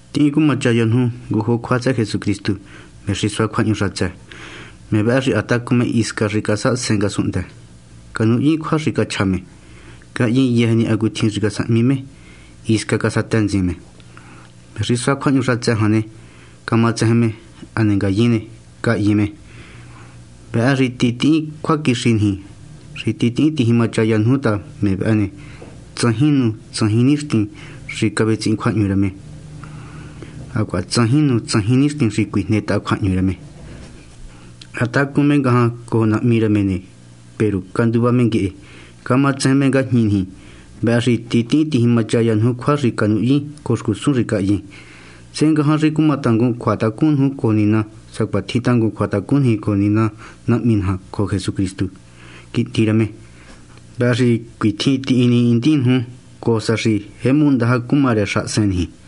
Tihín cumachaya nuju ngujo cjua tsëhë Jesucristu, me xi sua cjuahñu xatsë. Me vëhë xi ha tacun me hisca xi casahasen ngasunhndë. Canuhyin cjua xi cachja me. Cahyin yëjë ni hacutjin xi casahmi me. Hisca casatë ntsin me. Me xi sua cjuahñu jan ne, camatsejen me. Hane ngayin ne, cahyin me. Vëhë xi titihín cjuaquixi niji, xi titihín tijimachaya nuju ta me vëhë ne, tsajin nu tsajin nixtin xi cavetsihin cjuahñu rë me, hacuaha tsajin nu tsajin nixtin xi cuijnetaha cjuahñu rë me. Ha tacun me ngajan cojo Nahmi rë me ne, peru canduva me nguehe, cama tsejen me ngajñi niji. Vëhë xi titihín tijimachaya nuju cjua xi canuhyin cojo xcusun xi cahyin, sehe ngajan xi cuma tangun cjuatacun nuju cojo Nina sacuatjin tjin tangun cjuatacun niji cojo Nina Nahmi naja cojo Jesucristu, Quihndi rë me. Vëhë xi cuitjin tinihindin nuju, cojo sa xi jemu ndaja cuma rë xahasen niji.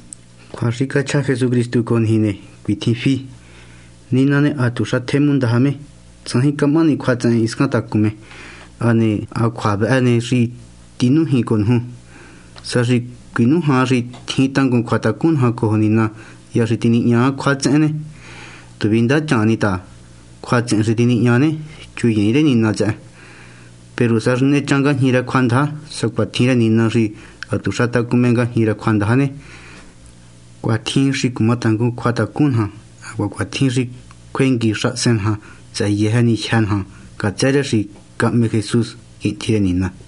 Cjua xi cachja Jesucristu cojo niji ne, cuitjin fi: Nina ne, hatuxa tjemu ndaja me. Tsajin camahani cjuatsehen hiscan tacun me. Hane ha cjua vëhë ni xi tinújin cojo nuju. Sa xi cuinújan xi tjin tangun cjuatacun naja cojo Nina hya xi tinihña cjuatsehen ne, tu vindachan ni ta, cjuatsehen xi tinihña ne, chuyiin rë Nina tsëhë. Peru sa xi nechan ngajñi rë cjuandaja, sacuatjin rë Nina xi hatuxa tacun me ngajñi rë cjuandaja ne, cuatjin xi cuma tangun cjuatacun naja. Hacuaha cuatjin xi cjuengui xahasen naja tsëhë yëjë ni jyë́ naja, ngatsë rë xi cahme Jesús, Quihndi rë Nina.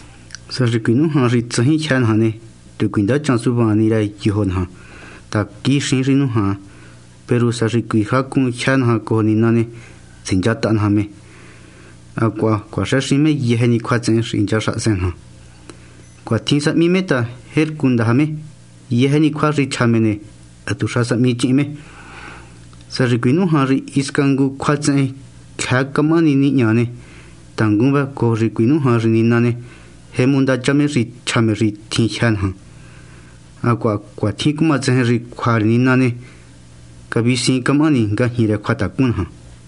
Sa xi cuinújan xi tsajin jyë́ naja ne, tu cuindachan suvaan ni rë yojo naja ta, quixiin xi nújan. Peru sa xi cuijacun jyë́ naja cojo Nina ne, tsinchataha naja me, hacuaha cuaxëxin me yëjë ni cjuatsehen xi hincha xahasen naja. Cuatjin sahmi me ta tjercu ndaja me. Yëjë ni cjua xi chja me ne, hatuxa sahmi chihin me. Sa xi cuinújan xi hisca ngu cjuatsehen cjëë camahani nihña ne, tangun vëhë cojo xi cuinújan xi Nina ne, jemu ndacha me xi chja me xi tjin jyë́ naja, hacuaha cuatjin cumatsejen xi cjua rë Nina ne, cavisiin camahani ngajñi rë cjuatacun naja.